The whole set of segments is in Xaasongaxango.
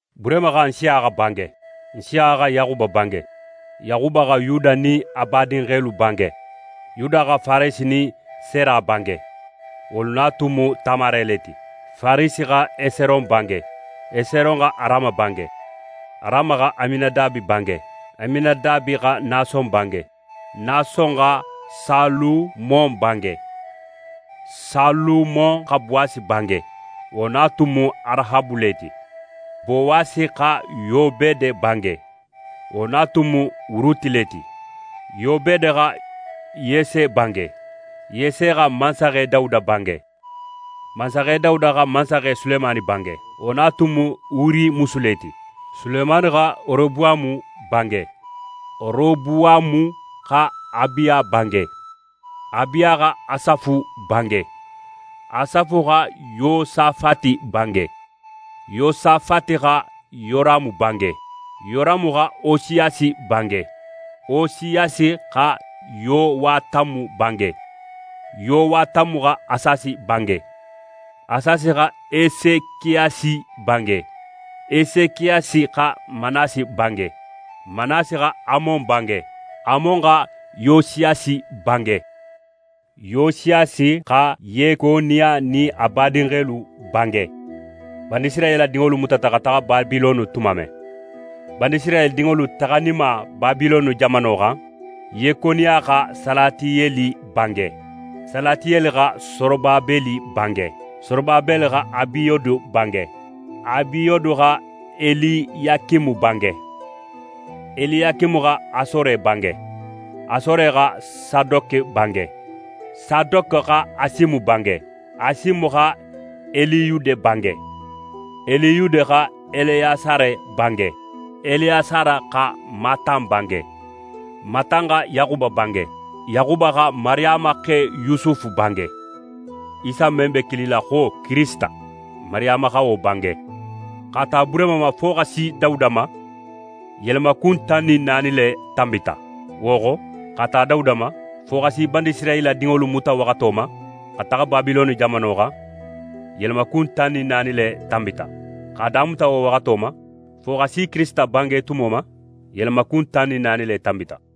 Burehima xa Nsiyaxa bange, Nsiyaxa xa Yaxuba bange, Yaxuba xa Yuda nin a badinxelu bange. Yuda xa Faresi nin Sera bange, wolu na tun mu Tamare le ti. Faresi xa Eseron bange, Eseron xa Arama bange. Arama xa Aminadabe bange, Aminadabe xa Nason bange, Nason xa Salumon bange, Salumon xa Bowasi bange, wo na tun mu Arahabu le ti. Bowasi xa Yobede bange, wo na tun mu Ruti le ti. Yobede xa Yese bange. Yese xa mansaxe Dawuda bange. Mansaxe Dawuda xa mansaxe Sulemani bange, wo na tun mu Uri musu le ti. Sulemani xa Robuwamu bange, Robuwamu xa Abiya bange, Abiya xa Asafu bange, Asafu xa Yosafati bange, Yosafati xa Yoramu bange, Yoramu xa Osiyasi bange, Osiyasi xa Yowatamu bange, Yowatamu xa Asasi bange, Asasi xa Esekiyasi bange. Esekiyasi xa Manase bange, Manase xa Amon bange, Amon xa Yosiyasi bange. Yosiyasi xa Yekoniya nin a badinxelu bange, Banisirayila dinŋolu mutata xa taxa Babilone tumo men. Banisirayila dinŋolu taxaninma Babilone jamano xan, Yekoniya xa Salatiyeli bange, Salatiyeli xa Sorobabeli bange, Sorobabeli xa Abiyode bange, Abiyode xa Eliyakime bange, Eliyakime xa Asore bange, Asore xa Sadoke bange, Sadoke xa Asime bange, Asime xa Eliyude bange, Eliyude xa Eleyasare bange, Eleyasare xa Matan bange, Matan xa Yaxuba bange, Yaxuba xa Mariyama xe Yusufu bange, Isa men be kilila xo Kirisita, Mariyama xa wo bange. X'a ta Burehima ma fo xa si Dawuda ma, yelemakun tan nin naani le tanbita. Wo xo, x'a ta Dawuda ma fo xa si Banisirayila dinŋolu muta waxato ma xa taxa Babilone jamano xan, yelemakun tan nin naani le tanbita. X'a damuta wo waxato ma fo xa si Kirisita bange tumo ma, yelemakun tan nin naani le tanbita.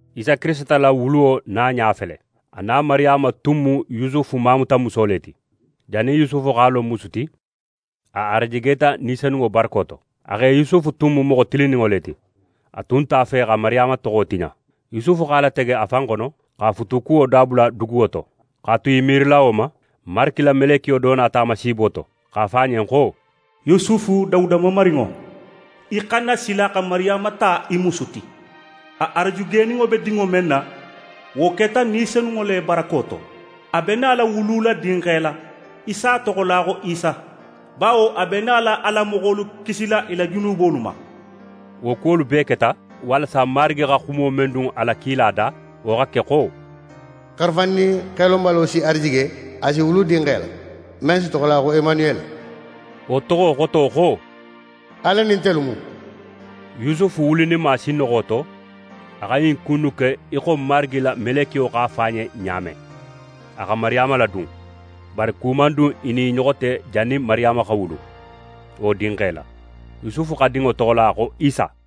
Isa Kirisita la wuluwo naɲa fele: A na Mariyama tun mu Yusufu mamutamuso le ti. Jannin Yusufu x'a lon musu ti, a arajigeta Ni Senunŋo barako to. A xe Yusufu tun mu moxo tilinninŋo le ti. A tun nte a fe xa Mariyama toxo tiɲa. Yusufu x'a latege a fan xono x'a futukuwo dabula duguwo to. X'a tu í miirila wo ma, Marigi la melekiyo do nata a ma siibo to, x'a fo a ɲen xo: «Yusufu, Dawuda mamarinŋo, í xana sila xa Mariyama ta í musu ti, a arajigeninŋo be dinŋo men na, wo keta Ni Senunŋo le barako to. A be nala wulula dinxe la. Í si a toxola xo Isa, bawo a be nala a la moxolu kisila i la junubolu ma.» Wo kuwolu bee keta, walasa Marigi xa xumo men dun a la kila da, wo xa ke, xo: «Xarafandin xelonbalo si arajige, a si wulu dinxe la, men si toxola xo Emanuyeli», wo toxo xoto xo: «Ala nin ntelu mu». Yusufu wulininma sinnoxo to, a xa ɲin ku innu ke í xo Marigi la melekiyo x'a fo a ɲen ɲa men. A xa Mariyama ladun, bari ku man dun i nin i ɲoxo te jannin Mariyama xa wulu wo dinxe la. Yusufu xa dinŋo toxola xo Isa.